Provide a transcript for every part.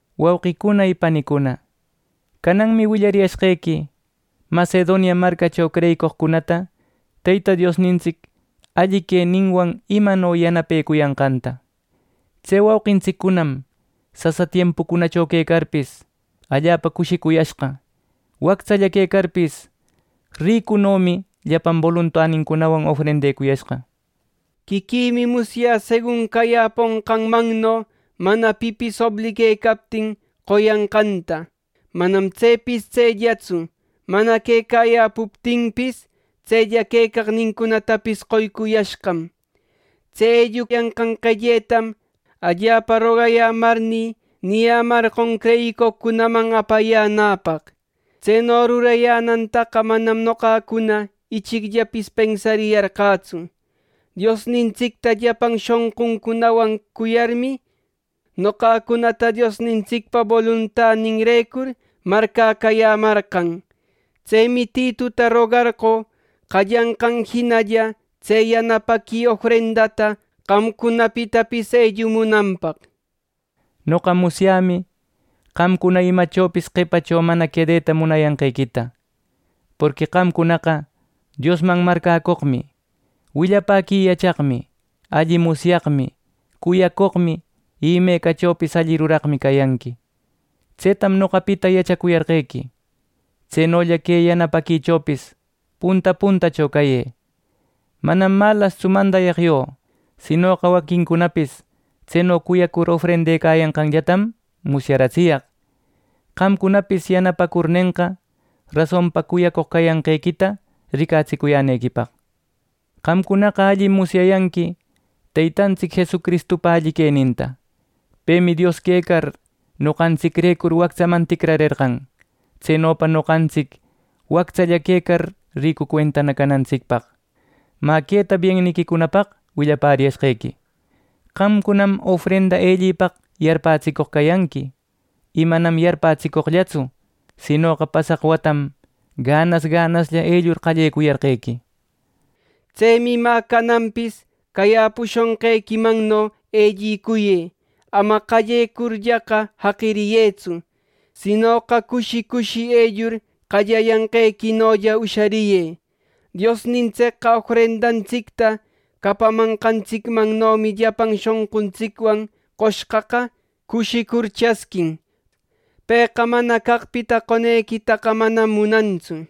Wauqicuna y panicuna, cananmi willariyashqequi Macedonia marcacho creyicoqcunata Teyta Diosnintsic alli queninwan imano yanapecuyanqanta. Tse wauqintsiccunam sasa tiempucunacho quecarpis, allapa cushicuyashqa wactsalla quecarpis, ricuno llapan boluntanincunwan ofrendecuyashqa. Quiquïmi musyä segun cayäponqanmanno, mana pipis obliguecaptin, qoyanqanta. Manam tsepis tsellatsu, mana quecayäpuptinpis, tsella caqnincunatapis qoycuyashqam. Tse elluyanqan qelletam allapa rogayämarnï niyämarqon creyicoqcunaman apayänäpaq. Tseno rurayänantaqa manam noqacuna ichicllapis pensariyarqätsu. Diosnintsicta llapan shonqücunawan cuyarmi, noqacunata Diosnintsicpa boluntaninrecur marcäcayämarqan. Tsemi Tituta rogarqö qallanqan jinalla, tse yanapaqui ofrendata qamcunapitapis ellumunanpaq. Noqa musyämi qamcuna imachopis qepacho mana quedeta munayanqequita. Porqui qamcunaqa Diosman marcäcoqmi, willapäqui yachaqmi, alli musyaqmi, cuyacoqmi y imecachopis alli ruraqmi cayanqui. Tsetam noqapita yachacuyarqequi. Tsenolla que yanapaquichopis punta puntacho cayë. Manam malastsu mandayaq yo; sinoqa waquincunapis tseno cuyacur ofrendecayanqanllatam musyaratsiyaq, qamcunapis yanapacurnenqa, rasonpa cuyacoq cayanqequita ricatsicuyänequipaq. Qamcunaqa allim musyayanqui Teytantsic Jesucristupa alli queninta. Pemi Dios quecar noqantsicrecur wactsaman ticrarerqan, tsenopa noqantsic wactsa quecar ricu cuentana canantsicpaq. Mä queta bienniquicunapaq willapäriyashqequi: Qamcunam ofrenda ellipaq yarpapätsicoq cayanqui, y manam yarpapätsicoqllatsu; sinoqa pasaq watam ganas ganaslla ellur qallecuyarqequi. Tsemi mä cananpis cayäpushonqequimanno ellicuyë; ama qallecurllaqa jaqiriyëtsu, sinoqa cushi cushi ellur qallayanqequinolla ushariyë. Diosnintsicqa ofrendantsicta capamanqantsicmanno llapan shonquntsicwan qoshqaqa cushicurmi chasquin. Pëqa mana caqpita qonequitaqa, manam munantsu.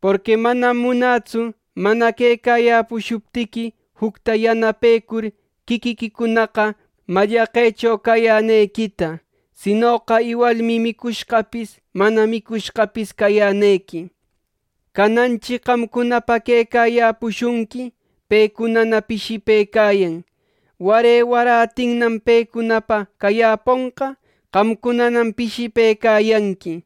Porqui manam munätsu mana quecayäpushuptiqui, jucta yanapecur quiquiquicunaqa mallaqecho cayänequita; sinoqa iwalmi micushqapis mana micushqapis cayänequi. Cananchi qamcunapa quecayäpushunqui, pecunana pishipëcayan; ware warätinnam pecunapa cayäponqa, qamcunanam pishipëcayanqui.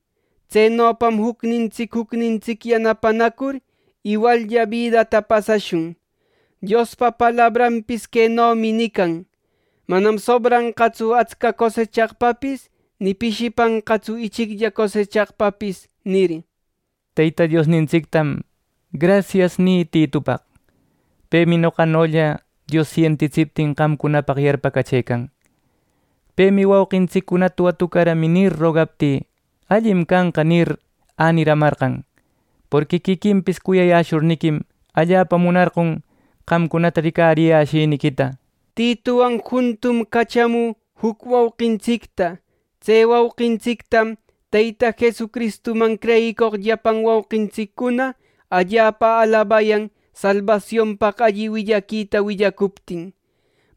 Tsenopam jucnintsic jucnintsic yanapanacur, iwallla bidata pasashun. Diospa palabranpis quenomi nican: “Manam sobranqatsu atsca cosechaqpapis, ni pishipanqatsu ichiclla cosechaqpapis” nir. Teyta Diosnintsictam “Grasias” nï Titupaq. Pemi noqanolla Dios sentitsiptin, qamcunapaq yarpacachëcan. Pemi “Wauqintsiccunata watucaramï” nir, rogaptï, “Allim canqa” nir, äniramarqan; porqui quiquinpis cuyayäshurniquim allapa munarqon qamcunata ricariyäshiniquita. Titutawan juntum cachamü juc wauqintsicta. Tse wauqintsictam Teyta Jesucristuman creyicoq llapan wauqintsiccuna allapa alabayan salbasionpaq alli willaquita willapäcuptin.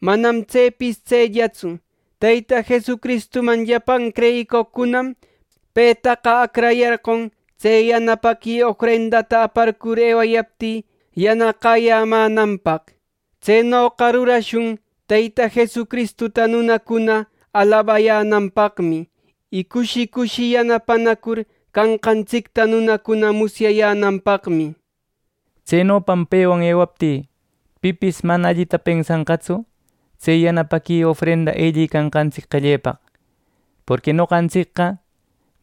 Manam tsepis tsellatsu, Teyta Jesucristuman llapan creyicoqcunam petaqa acrayarqon tse yanapaqui ofrendata aparcur ewayaptï yanaqäyämänanpaq. Tsenoqa rurashun Teyta Jesucristuta nunacuna alabayänanpaqmi, y cushi cushi yanapanacur canqantsicta nunacuna musyayänanpaqmi. Tsenopam pewan ewaptï pipis mana allita pensanqatsu, tse yanapaqui ofrenda ellicanqantsic qellepaq. Porqui noqantsicqa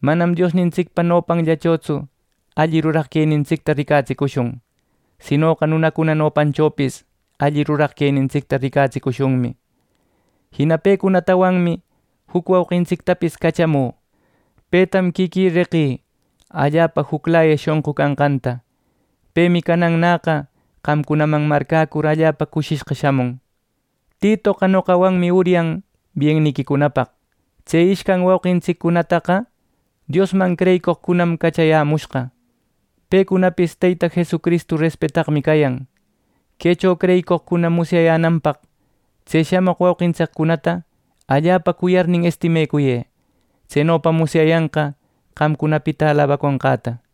manam Diosnintsicpa nopanllachotsu alli ruraq quenintsicta ricatsicushun; sinoqa nunacuna nopanchopis alli ruraq quenintsicta ricatsicushunmi. Jina pecunatawanmi juc wauqintsictapis cachamü. Petam quiquï reqï allapa juclaya shonqu canqanta. Pemi canannäqa qamcunaman marcäcur allapa cushishqa shamun. Titoqa noqawanmi uryan bienniquicunapaq. Tse ishcan waquintsiccunataqa Diosman creyicoqcunam cachayämushqa. Pecunapis Teyta Jesucristu respetaqmi cayan Quecho creyicoqcuna musyayänanpaq, tse shamoq wauqintsiccunata allapa cuyarnin estimecuyë. Tsenopam musyayanqa qamcunapita alabaconqäta.